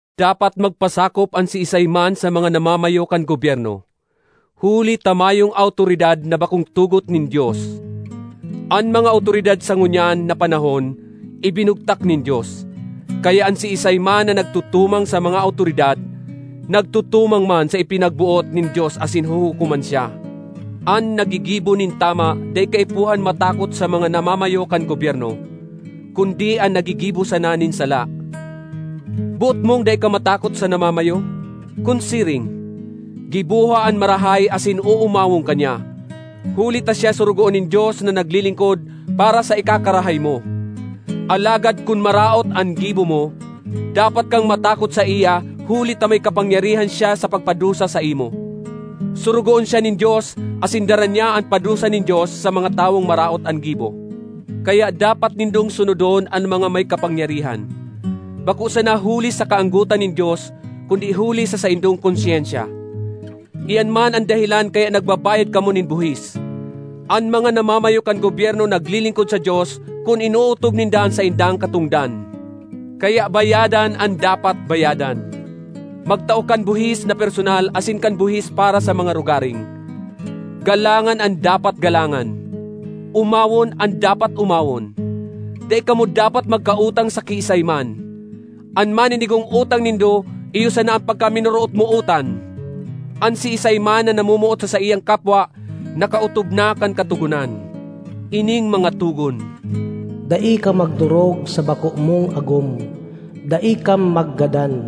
Dapat magpasakop an siisay man sa mga namamayo kan gobyerno, huli ta mayong awtoridad na bakong tugot nin Dios. An mga awtoridad sa ngunyan na panahon ibinugtak nin Dios. Kaya an siisay man na nagtutumang sa mga awtoridad, nagtutumang man sa ipinagboot nin Dios asin huhukoman siya. An naggigibo nin tama dai kaipuhan matakot sa mga namamayo kan gobyerno, kundi an naggigibo sana nin sala. Boot mong dai ka matakot sa namamayo? Kun siring, giboha an marahay asin oomawon ka niya. Huli ta siya sorogoon nin Dios na naglilingkod para sa ikakarahay mo. Alagad kun maraot an gibo mo, dapat kang matakot saiya huli ta may kapangyarihan siya sa pagpadusa saimo. Sorogoon siya nin Dios asin dara niya an padusa nin Dios sa mga tawong maraot an gibo. Kaya dapat nindong sunodon an mga may kapangyarihan, bako sana huli sa kaanggotan nin Dios kundi huli sa saindong konsyensya. Iyan man an dahelan kaya nagbabayad kamo nin buhis. An mga namamayo kan gobyerno naglilingkod sa Dios kun inootob ninda an saindang katongdan. Kaya bayadan an dapat bayadan, magtao kan buhis na personal asin kan buhis para sa mga rogaring. Galangan an dapat galangan; omawon an dapat omawon. Dai kamo dapat magkautang sa kiisay man—an maninigong utang nindo iyo sana an pagkaminorootmootan. An siisay man na namomoot sa saiyang kapwa nakaotob na kan Katogonan. Ining mga togon, “Dai ka magdorog sa bako mong agom; dai ka maggadan;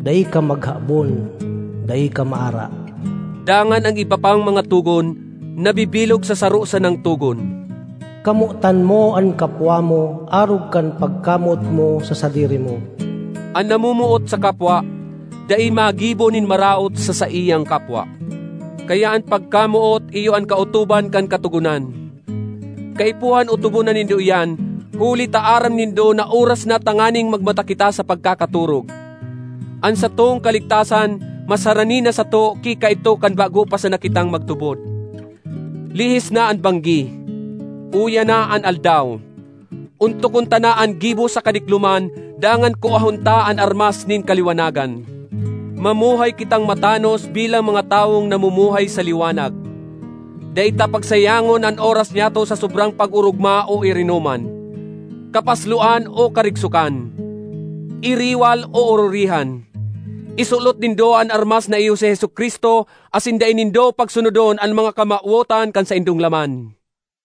dai ka maghabon; dai ka maara,” dangan an iba pang mga togon, nabibilog sa saro sanang togon, “Kamotan mo an kapwa mo, arog kan pagkamoot mo sa sadiri mo.” An namomoot sa kapwa, dai magibo nin maraot sa saiyang kapwa. Kaya an pagkamoot iyo an kaotoban kan Katogonan. Kaipuhan otobon na nindo iyan huli ta aram nindo na oras na tanganing magmata kita sa pagkakatorog. An satong kaligtasan mas harani na sato ki kaidto kan bago pa sana kitang magtubod. Lihis na an banggi; uya na an aldaw. Ontokon ta na an gibo sa kadikloman dangan kuahon ta an armas nin kaliwanagan. Mamuhay kitang matanos bilang mga tawong namumuhay sa liwanag; dai ta pagsayangon an oras nyato sa sobrang pag-orogma o irinoman, kapasloan o karigsokan, iriwal o ororihan. Isulot nindo an armas na iyo si Jesu-Cristo asin dai nindo pagsunodon an mga kamawotan kan saindong laman.